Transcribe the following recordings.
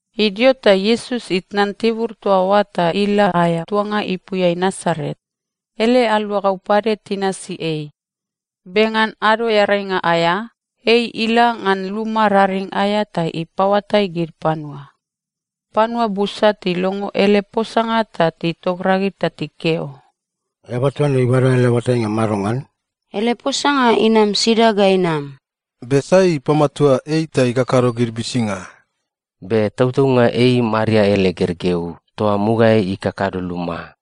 Idio ta Iesus itnan tibur toa oa ta ila aea tuanga ipuiai Nasaret. Ele aluagau pade tinasi ei. Be ngan Ado Earainga aea, ei ila ngan luma raring aea ta ipaoatai gid panua. Panua busa tilongo ele posanga ta titogragid ta tikeo, “Eaba toa ne ibada ele oatainga madongan? Ele posanga inam sida ga inam? Be sai ipamatua ei ta ikakado gid uisinga? Be tautaunga ei Maria ele gergeu toa mugaeai ikakado luma.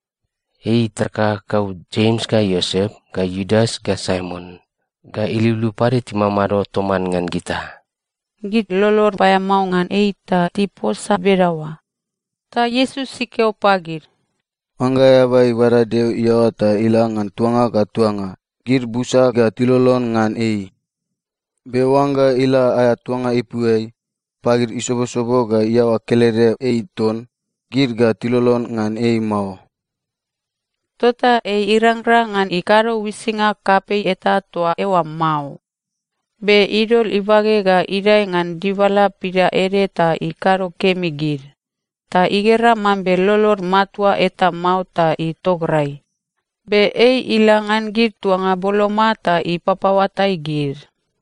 Ei itar kakakau Jems ga Iosep ga Iudas ga Saimon ga iliuliu pade timamado toman ngan gita.” Gid lolod paeamao ngan ei ta tiposa bedaoa. Ta Iesus ikeo pagid, “Oangga eaba ibada Deo iaoa ta ila ngan tuanga ga tuanga, gid busa ga tilolon ngan ei. Be oangga ila aea tuanga ipuiai, pagid isobosobo ga iaoa kelede ei ton, gid ga tilolon ngan ei mao.” Tota ei irangrang ngan ikado uisinga kapei eta toa eoa mao. Be idol ibage ga idae ngan dibala pidaede ta ikado kemi gid. Ta igera mambe lolod matua eta mao ta itograi. Be ei ila ngan gid tuanga boloma ta ipapaoatai gid.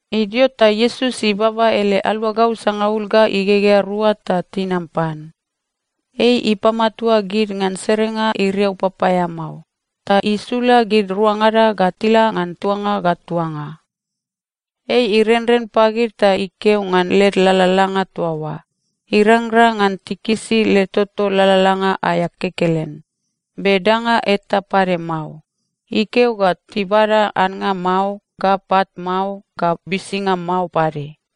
Idio ta Iesus ibaba ele aluagau sangaul ga igegea rua ta tinam pan. Ei ipamatua gid ngan serenga iriau papaeamao, ta isula gid ruangada ga tila ngan tuanga ga tuanga. Ei irenren pagid ta ikeo ngan led lalalanga toa oa, irangrang ngan tikisi led toto lalalanga aea kekelen, be danga eta pade mao. Ikeo ga tibada annga mao ga pat mao ga bisinga mao pade.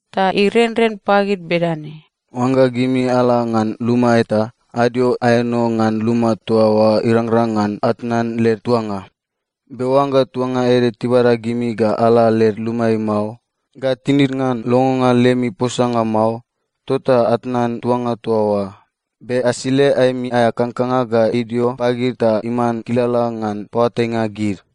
Ta irenren pagid bedane, “Oangga gimi ala ngan luma eta, adio aeno ngan luma toa oa irangrang ngan atnan led tuanga. Be oangga tuanga ede tibada gimi ga ala led lumaeai mao, ga tinid ngan longonga lemi posanga mao, tota atnan tuanga toa oa, be asile aemi aea kangkanga ga idio pagid ta iman kilala ngan paoatainga gid.”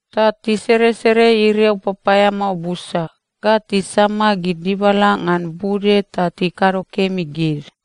Ta tiseresere iriau papaeamao busa, ga tisama gid dibala ngan bude ta tikado kemi gid.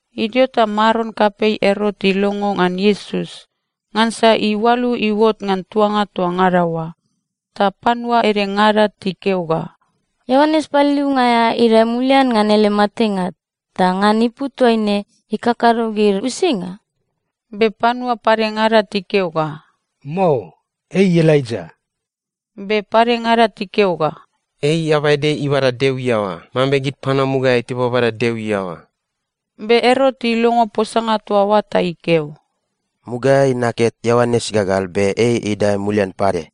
Idio ta maron kapei Erot ilongo ngan Iesus, ngansa iualu iuot ngan tuanga toa ngada oa. Ta panua edengada tikeo ga, “Ioanes Paliliunga aea idae mulian ngan ele matenga ta ngan ipu toaine ikakado gid uisinga.” Be panua padengada tikeo ga, “Mao, ei Elaija.” Be padengada tikeo ga, “Ei eaba ede ibada Deo iaoa, mambe gid panua mugaeai tibabada Deo iaoa.” Be Erot ilongo posanga toa oa ta ikeo, “Mugaeai naket Ioanes igagal, be ei idae mulian pade!”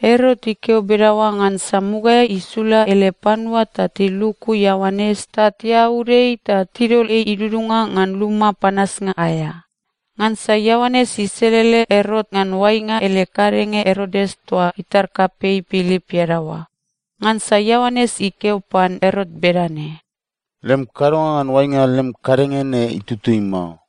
Erot ikeo bedaoa ngansa mugaeai isula ele panua ta tiluku Ioanes ta tiaud ei ta tidol ei idudunga ngan luma panasnga aea. Ngansa Ioanes iselele Erot ngan oainga ele kadenge Erodias toa itar kapei Pilip iadaoa. Ngansa Ioanes ikeo pan Erot bedane, “Lem kadonga ngan oainga lem kadenge ne itutui mao.”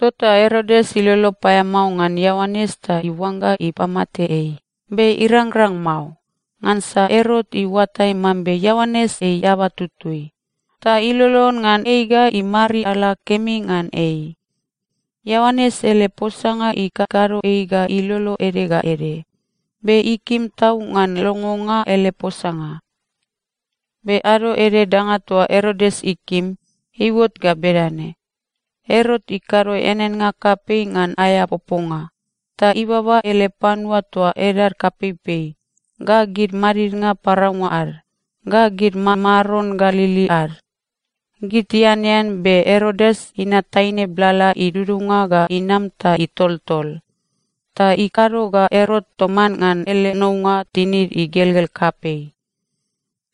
Tota Erodias ilolo paeamao ngan Ioanes ta iuangga ipamate ei, be irangrang mao. Ngansa Erot iuatai mambe Ioanes ei eaba tutui, ta ilolon ngan ei ga imariala kemi ngan ei. Ioanes ele posanga ikakado ei ga ilolo ede ga ede, be ikim tau ngan longonga ele posanga. Be ado ede danga toa Erodias ikim, iuot ga bedane: Erot ikado eaneannga kapei ngan aea poponga. Ta ibaba ele panua toa edad kapeipei, ga gid madidnga paraunga ad, ga gid mamaron Galili ad. Gid tianean, be Erodias inat taine blala idudunga ga inam ta itoltol. Ta ikado ga Erot toman ngan ele nounga tinid igelgel kapei.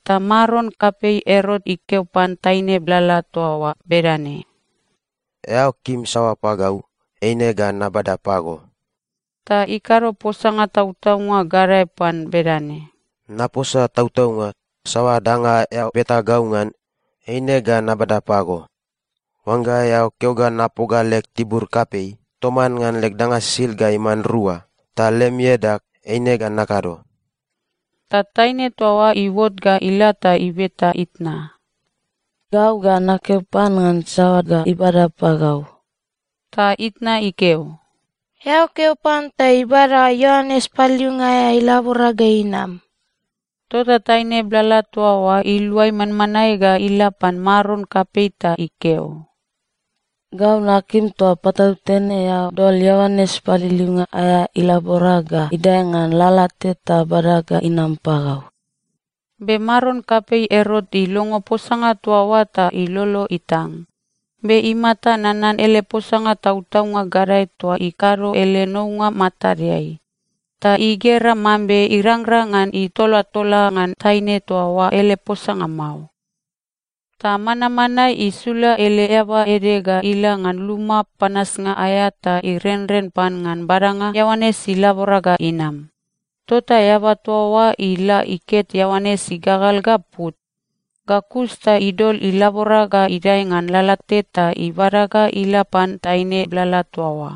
Ta maron kapei Erot ikeo pan taine blala toa oa bedane, “Eao kim saoa pagau, eine ga nabada pago.” Ta ikado posanga tautaunga gadae pan bedane, “Naposa tautaunga, saoa danga eao beta gau ngan, eine ga nabada pago. Oangga eao keo ga napoga leg tibur kapei toman leg danga sisid ga iman rua ta lem iadag, eine ga nakado.” Ta taine toa oa iuot ga ila ta ibeta itna, “Gau ga nakeo pan ngan saoa ga ibada pagau?” Ta itna ikeo, “Eao keo pan ta ibada Ioanes Paliliunga aea ilabora ga inam.” Tota taine blala toa oa iluai manmanae ga ila pan maron kapei ta ikeo, “Gau nakim toa patautene eao dol Ioanes Paliliunga aea ilabora ga idae ngan lalate ta bada ga inam pagau.” Be maron kapei Erot ilongo posanga toa oa ta ilolo itang. Be imata nanan ele posanga tautaunga gadae toa ikado ele nounga matadeai, ta igera mambe irangrang ngan itolatola ngan taine toa oa ele posanga mao. Ta manmanae isula ele eaba ede ga ila ngan luma panasnga aea ta irenren pan ngan badanga Ioanes ilabora ga inam. Tota eaba toa oa ila iket Ioanes igagal ga put. Ga kus ta idol ilabora ga idae ngan lalate ta ibada ga ila pan taine blala toa oa,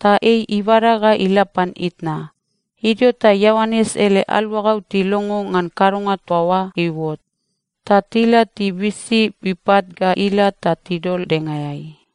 ta ei ibada ga ila pan itna. Idio ta Ioanes ele aluagau tilongo ngan kadonga toa oa iuot, ta tila tibisi ipat ga ila ta tidol dengaeai.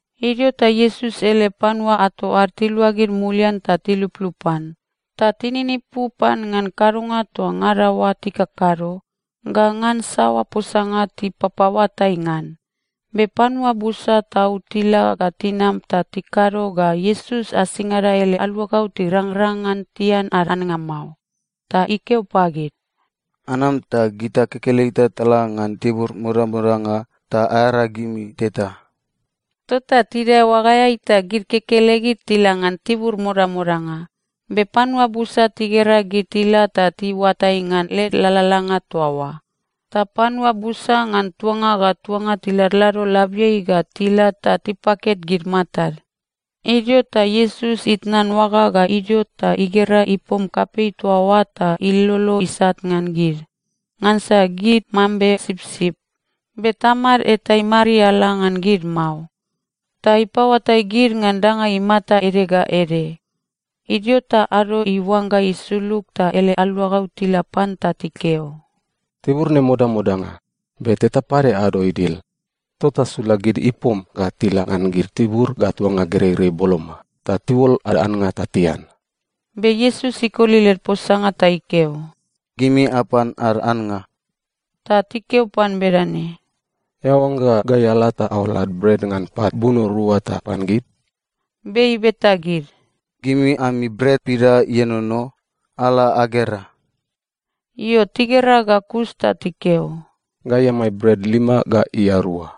Idio ta Iesus ele panua ato ad tiluagid mulian ta tiluplup pan. Ta tininipu pan ngan kadonga toa ngada oa tikakado ga ngan saoa posanga tipapaoatai ngan. Be panua busa tau tila ga tinam ta tikado ga Iesus asingada ele aluagau tirangrang ngan tian ad annga mao. Ta ikeo pagid, “Anam ta gita kekelegita tala ngan tibur modamodanga, ta aearagimi teta.” Tota tidae oagaeai ta gid kekelegid tila ngan tibur modamodanga. Be panua busa tigera gid tila ta tiuatai ngan led lalalanga toa oa. Ta panua busa ngan tuanga ga tuanga tiladlado labiai ga tila ta tipaket gid matad. Idio ta Iesus itnan oaga ga idio ta igera ipom kapei toa oa ta ilolo isat ngan gid, ngansa gid mambe sipsip, be tamad eta imariala ngan gid mao. Ta ipaoatai gid ngan danga imata ede ga ede. Idio ta ado iuangga isulug ta ele aluagau tila pan ta tikeo, “Tibur ne modamodanga, be teta pade ado idil. Tota sula gid ipom ga tila ngan gid tibur ga tuanga gereirei boloma, ta tiuol ad annga ta tian.” Be Iesus ikoli led posanga ta ikeo, “Gimi apan ad annga.” Ta tikeo pan bedane, “Eao oangga gai ala ta aol ad bret ngan pat buno rua ta apan gid?” Be ibeta gid, “Gimi ami bret pida ienono? Ala agera.” Io, tigera ga kus ta tikeo, “Gai amai bret lima ga ia rua.”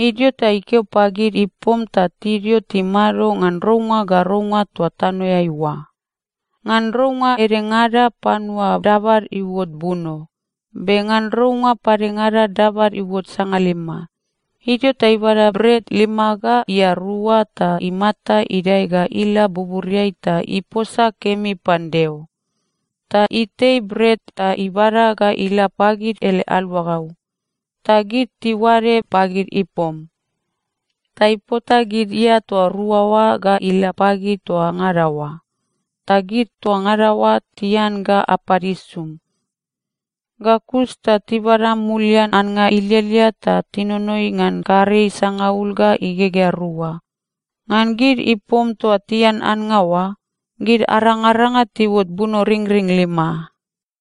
Idio ta ikeo pagid ipom ta tidio timado ngan rounga ga rounga toa tanoeai oa. Ngan rounga edengada panua dabad iuot buno, be ngan rounga padengada dabad iuot sangalima. Idio ta ibada bret lima ga ia rua ta imata idae ga ila buburiai ta iposa kemi pan Deo. Ta itei bret ta ibada ga ila pagid ele aluagau, ta gid tiuade pagid ipom. Ta ipota gid ia toa rua oa ga ila pagid toa ngada oa. Ta gid toa ngada oa tian ga apad isum. Ga kus ta tibada mulian annga ilialia ta tinonoi ngan karei sangaul ga igegea rua. Ngan gid ipom toa tian annga oa, gid arangaranga tiuot bunoringring lima.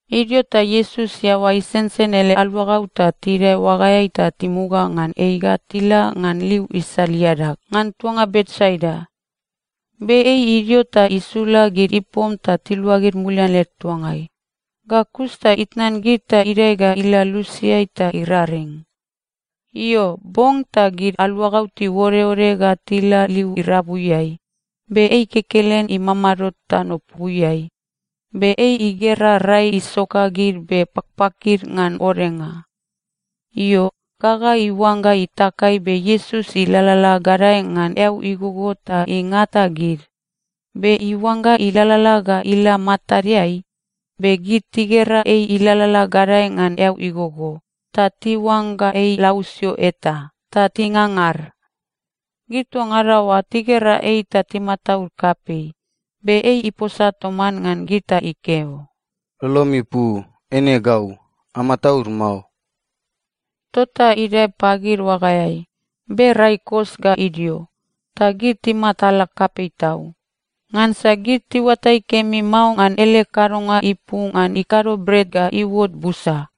Idio ta Iesus iaoa isensen ele aluagau ta tidae oagaeai ta timuga ngan ei ga tila ngan liu isal iadag, ngan tuanga Betsaida. Be ei idio ta isula gid ipom ta tiluagid mulian led tuangai. Ga kus ta itnan gid ta idae ga ila lusiai ta iraring. Io, bong ta gid aluagau tiuodeode ga tila liu irabuiai, be ei kekelen imamado tanopuiai. Be ei igera rai isoka gid be pakpakid ngan odenga. Io, gaga iuangga itakai be Iesus ilalala gadae ngan eau igogo ta ingata gid, be iuangga ilalala ga ila matadeai. Be gid tigera ei ilalala gadae ngan eau igogo, ta tiuangga ei lausio eta, ta tingangar. Gid toa ngada oa tigera ei ta timataud kapei. Be ei iposa toman ngan gid ta ikeo, “Lolomi pu! Eine gau. Amataud mao.” Tota idae pagid oagaeai, be rai kos ga idio. Ta gid timatala kapei tau. Ngansa gid tiuatai kemi mao ngan ele kadonga ipu ngan ikado bret ga iuot busa.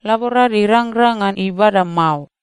Laborad irangrang ngan ibada mao.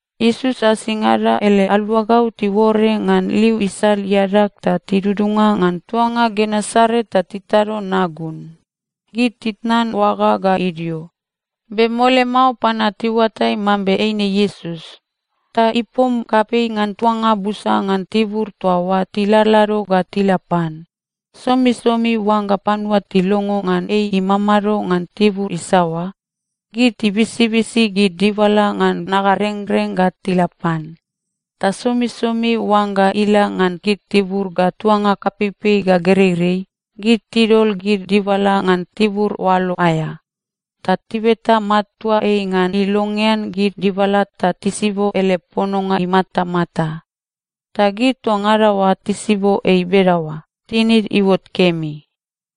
Iesus asingada ele aluagau tiuore ngan liu isal iadag ta tidudunga ngan tuanga Genesaret ta titado nagun. Gid titnan oaga ga idio, be mole mao panua tiuatai mambe eine Iesus. Ta ipom kapei ngan tuanga busa ngan tibur toa oa tiladlado ga tila pan. Somisomi oangga panua tilongo ngan ei imamado ngan tibur isaoa, gid tibisibisi gid dibala ngan nagarengreng ga tila pan. Ta somisomi oangga ila ngan gid tibur ga tuanga kapeipei ga gereirei, gid tidol gid dibala ngan tibur oalo aea, ta tibeta matua ei ngan ilongean gid dibala ta tisibo ele pononga imatamata. Ta gid toa ngada oa tisibo ei bedaoa, tinid iuot kemi.